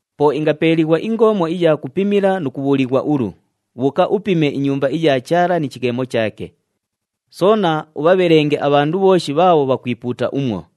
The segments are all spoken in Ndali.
Po ingapeeliighwa ingoomo iya kupimila nu kubhuulighwa ulu, “Bhuuka upime iNyumba iya Chaala ni chighemo chaake. Soona ubhabhelenge abhandu bhooshi bhaabho bhakwipuuta umwo.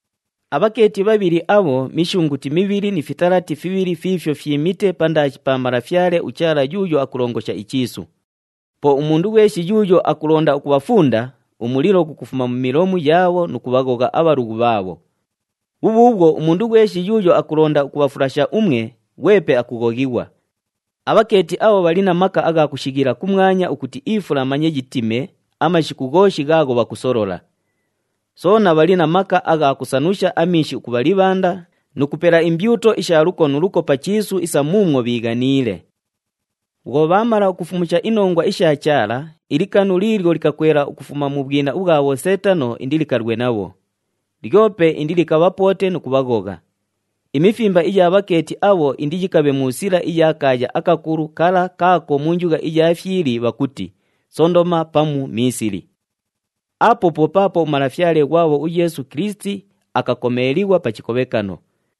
Abhakeeti bhabhili abho, mishunguti mibhili ni fitalati fibhili fiifyo fyimite pandaashi pa Malafyale uChaala yuuyo akulongosha ichiisu. Po umundu ghweshi yuuyo akulonda ukubhafunda, umulilo ghukufuma mu milomu yaabho nu kubhaghogha abhalughu bhaabho. Bhubhuubhwo umundu ghweshi yuuyo akulonda ukubhafulasha umwe, ghwepe akughoghighwa. Abhakeeti abho bhali na maka agha kushighila kumwanya ukuti ifula manye yitime amashiku ghooshi ghaagho bhakusolola. Soona bhali na maka agha kusanusha amiishi ukubha libhanda nu kupela imbyuto isha luko nu luko pa chiisu isa muumwo bhiighaniile. Bhwo bhaamala ukufumusha inongwa isha Chaala, ilikanu liilyo likakwela ukufuma mu bhwina ubhwa bhoseetano, indilikalwe nabho. Lyope indilikabhapoote nu kubhaghogha. Imifimba iya bhakeeti abho indiyikabhe mu sila iya kaaya akakulu kala kaako mu njugha iya fyili bhakuti, Sondoma pamu Miisili. Apo po paapo uMalafyale ghwabho uYeesu Kilisiti akakomeelighwa pa chikobhekano.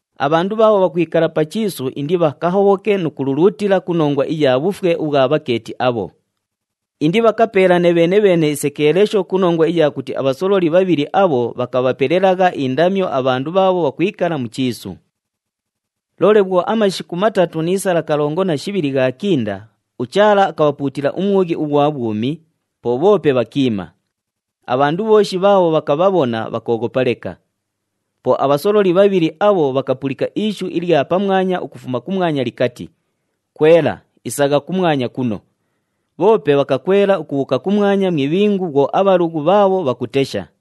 Abhandu bhaabho bhakwikala pa chiisu indibhakahobhoke nu kululuutila ku nongwa iya bhufwe ubhwa bhakeeti abho. Indibhakapeelane bheene-bheene isekeelesho ku nongwa iya kuti abhasololi bhabhili abho bhakabhapelelagha indamyo abhandu bhaabho bhakwikala mu chiisu. Loole bhwo amashiku matatu ni sala kalongo na shibhili ghaakinda, uChaala akabhapuutila umwughi ughwa bhwumi, po bhoope bhakiima. Abhandu bhooshi bhaabho bhakabhabhona bhakooghopa leka. Po abhasololi bhabhili abho bhakapulika ishu ilya pamwanya ukufuma kumwanya likati, “Kwela, isagha kumwanya kuno!” Bhoope bhakakwela ukubhuuka kumwanya mu ibhingu bhwo abhalughu bhaabho bhakutesha.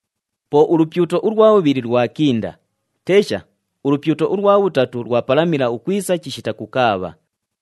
Po ulupyuto ulwa bhubhili lwakinda. Tesha, ulupyuto ulwa bhutatu lwapalamila ukwisa chishita kukaabha.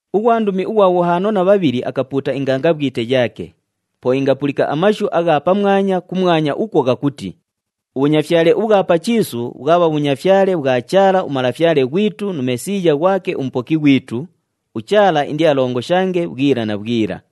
Ughwandumi ughwa bhuhaano na bhabhili akapuuta ingangabhwite yaake. Po ingapulika amashu agha pamwanya kumwanya ukwo ghakuti, “Ubhunyafyale ubhwa pa chiisu, bhwabha bhunyafyale bhwa Chaala uMalafyale ghwitu nu Mesiiya ghwake uMupoki ghwitu, uChaala indialongoshange bhwila na bhwila.”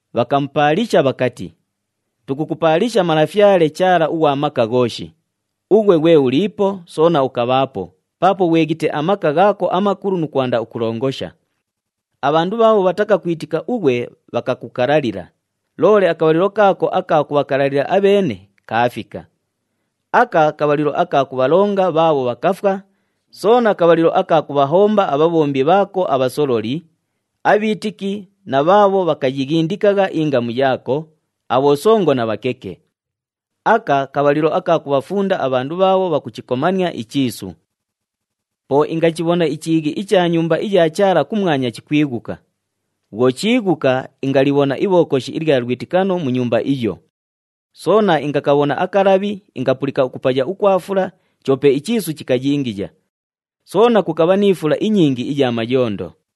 Bhakamupaalisha bhakati, “Tukukupaalisha Malafyale Chaala ughwa Maka Ghooshi, ughwe ghwe uliipo, soona ukabhaapo, paapo ghweghite amaka ghaako amakulu nu kwanda ukulongosha. Abhandu bhaabho bhatakakwitika ughwe bhakakukalalila, loole akabhalilo kaako aka kubhakalalila abheene, kaafika. Aka kabhalilo aka kubhalonga bhaabho bhakafwa, soona kabhalilo aka kubhahomba abhabhombi bhaako abhasololi, abhiitiki na bhaabho bhakayighindikagha ingamu yaako, abhosongo na bhakeke. Aka kabhalilo aka kubhafunda abhandu bhaabho bhakuchikomania ichiisu.” Po ingachibhona ichiighi icha Nyumba iya Chaala kumwanya chikwighuka. Bhwo chiighuka, ingalibhona Ibhokoshi ilya Lwitikano mu Nyumba iyo. Soona ingakabhona akalabhi, ingapulika ukupaya ukwa fula, choope ichiisu chikayingiya. Soona kukabha ni fula inyingi iya mayondo.